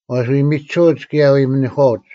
ᐊ ᐎ ᒥᒋᓱᐅᒡ ᑭᔭ ᐊ ᐎ ᒥᓂᒂᒡ,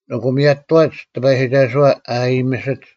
ᐊᑯ ᒥᔭᑐᐛᒡ ᑎᐸᔨᒋᒐᓱᐛ ᐊ ᐊᔨᒥᓯᒡ,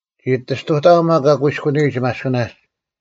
ᒋ ᐊᑎ ᔅᑐᑕᐊᐤ ᒪᒃ ᐊ ᑯᐃᔎᓂᔨᒡ ᒪᔅᑭᓇᒡ,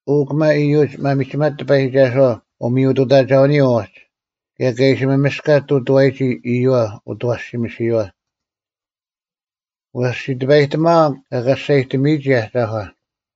ᐅ, ᑭᒪ ᐃᔪᒡ ᒪᒥᒋᒪᒡ ᑎᐸᔨᒋᒐᓱᐛ ᐅᒥᔪᑐᑕᒐᐅᓂᔪᐤ ᐅᒡ, ᑭᔭ ᑲ ᐃᓯ ᒪᒥᔅᑲᒡ ᑐᑐᐛᔨᒋ ᐃᔪᐛ ᐅᑦ ᐊᐛᓯᒥᓯᔨᐛ! ᐛᔅ ᑕᐸᔨᑕᒥᐊᐤ ᑲ ᑲᔅᒐᔨᑎᒥᔨᒋ ᐊᒐᒂ,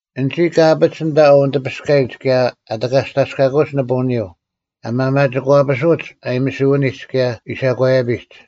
ᐊᓐᒋ ᑲ ᐊᐱᒡ ᐊᓐᑕ ᐊ ᐅᓂᑎᐱᔅᑲᔨᒡ ᑭᔭ ᐊ ᑎᑲᔅᑕᔅᑲᑯᒡ ᓂᐳᐅᓂᔪᐤ, ᐊ ᒪᒪᒋᒂᐱᓱᒡ ᐊᔨᒥᓯᐅᓂᒡ ᑭᔭ ᐃᓴᒂᔭᐱᒡ;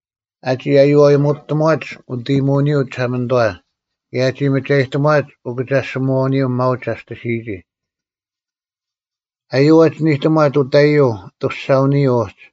ᐊᒋ ᐊᔪᐛᔨᒧᑐᑎᒺᒡ ᐅᑦ ᐃᔨᒧᐅᓂᔪᐤ ᒋᓴᒪᓂᑐᐛ, ᑭᔭ ᐊᒋ ᒪᒐᔨᑎᒺᒡ ᐅᑭᒐᔅᒋᒧᐛᐅᓂᔪᐤ ᒪᐅᒡ ᒐᔅᑎᓯᔨᒋ; ᐊᔪᐅᒄ ᐛᒋ ᓂᑎᓂᒺᑦ ᐅᑕᐃᔪᐤ ᐊᑐᔅᒐᐅᓂᔪᐤ ᐅᒡ;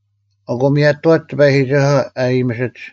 ᐊᑯ ᒥᔭᑐᐛᒡ ᑎᐸᔨᒋᒐᓱᐛ ᐊ ᐊᔨᒥᓯᒡ,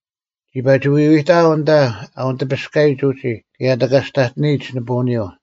ᒋ ᐸᒋ ᐎᐎᑕᐊᐤ ᐊᓐᑕ ᐊ ᐅᓂᑎᐱᔅᑲᔨᒡ ᐅᒋ ᑭᔭ ᐊ ᑎᑲᔅᑕᑎᓂᔨᒡ ᓂᐳᐅᓂᔪᐤ,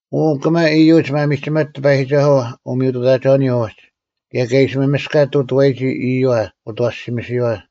ᐅ, ᑭᒪ ᐃᔪᒡ ᒪᒥᒋᒪᒡ ᑎᐸᔨᒋᒐᓱᐛ ᐅᒥᔪᑐᑕᒐᐅᓂᔪᐤ ᐅᒡ, ᑭᔭ ᑲ ᐃᓯ ᒪᒥᔅᑲᒡ ᑐᑐᐛᔨᒋ ᐃᔪᐛ ᐅᑦ ᐊᐛᓯᒥᓯᔨᐛ!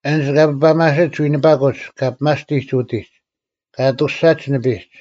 ᐊᓐᒡ ᑲ ᐱᐸᒪᓯᒡ ᐎᓂᐸᑯᒡ ᑲ ᐱᒪᔅᑎᒡ ᐅᐤᑎᒡ, ᑲ ᐊᑐᔅᒐᒡ ᓂᐱᒡ;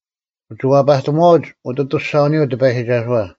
ᐅᒋ ᐛᐸᑎᒺᐅᒡ ᐅᑦ ᐊᑐᔅᒐᐅᓂᔪᐤ ᑎᐸᔨᒋᒐᓱᐛ,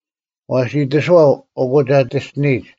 ᐛᔅ ᐃᑎᓱᐛᐤ, ᐊᑯ ᒐᑎᔅᑎᓂᔨᒡ,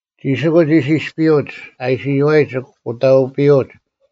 ᒋᓯᑯᒡ ᐃᓯ ᐃᔅᐱᔪᐅᒡ, ᐊ ᐃᓯ ᔪᐛᔨᒡ ᑯᑕᐅᐱᔪᐅᒡ: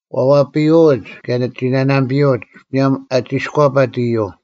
ᐛᐛᐱᔪᐅᒡ, ᑭᔭ ᓇᓇᒐᐱᔪᐅᒡ ᒧᔭᒻ ᐊ ᒋᔎᐸᑦ ᐃᔪᐤ,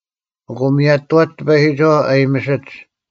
ᐊᑯ ᒥᔭᑐᐛᒡ ᑎᐸᔨᒋᒐᓱᐛ ᐊ ᐊᔨᒥᓯᒡ,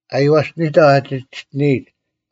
ᐊᔽᔅᑎᓂᑕᐤ ᐊ ᒋᑎᔅᑎᓂᔨᒡ,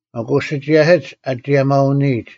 ᐊᑯ ᓴᒋᔭᓯᒡ ᐊ ᒋᔭᒪᐅᓂᔨᒡ;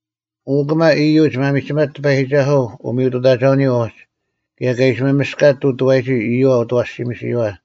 ᐅ, ᑭᒪ ᐃᔪᒡ ᒪᒥᒋᒪᒡ ᑎᐸᔨᒋᒐᓱᐛ ᐅᒥᔪᑐᑕᒐᐅᓂᔪᐤ ᐅᒡ, ᑭᔭ ᑲ ᐃᓯ ᒪᒥᔅᑲᒡ ᑐᑐᐛᔨᒋ ᐃᔪᐛ ᐅᑦ ᐊᐛᓯᒥᓯᔨᐛ!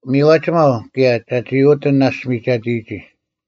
ᒥᔽᒋᒪᐤ ᑭᔭ, ᒐᒋ ᐅᒋ ᐊᑎ ᓇᔅᒡ ᒥᒐᑎᔨᒋ;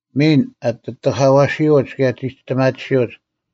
ᒥᓐ, ᐊᑎ ᑎᑲᐛᓯᐅᒡ ᑭᔭ ᒋᔅᑎᒪᑎᓯᐅᒡ,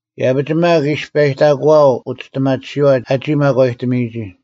ᐃᔭᐱᒡ ᒪᒃ ᐃᔅᐸᔨᑕᑯᐊᐤ ᐅᒋᔅᑎᒪᑎᓯᐛ ᐊᒋ ᒪᒂᔨᑎᒥᔨᒋ,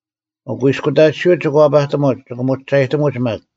ᐅᑯᐃᔅᑯᑕᑎᓯᐅᒡ ᒋᑭ ᐛᐸᑎᒧᒡ, ᒋᑭ ᒧᒋᒐᔨᑎᒧᒡ ᒪᒃ;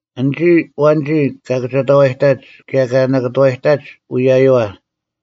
ᐊᓐᒋ ᐊᐛᓐᒋ ᑲ ᑭᒐᑕᐛᔨᑕᒡ, ᑭᔭ ᑲ ᓇᑭᑐᐛᔨᑕᒡ ᐅᔭᔪᐛ,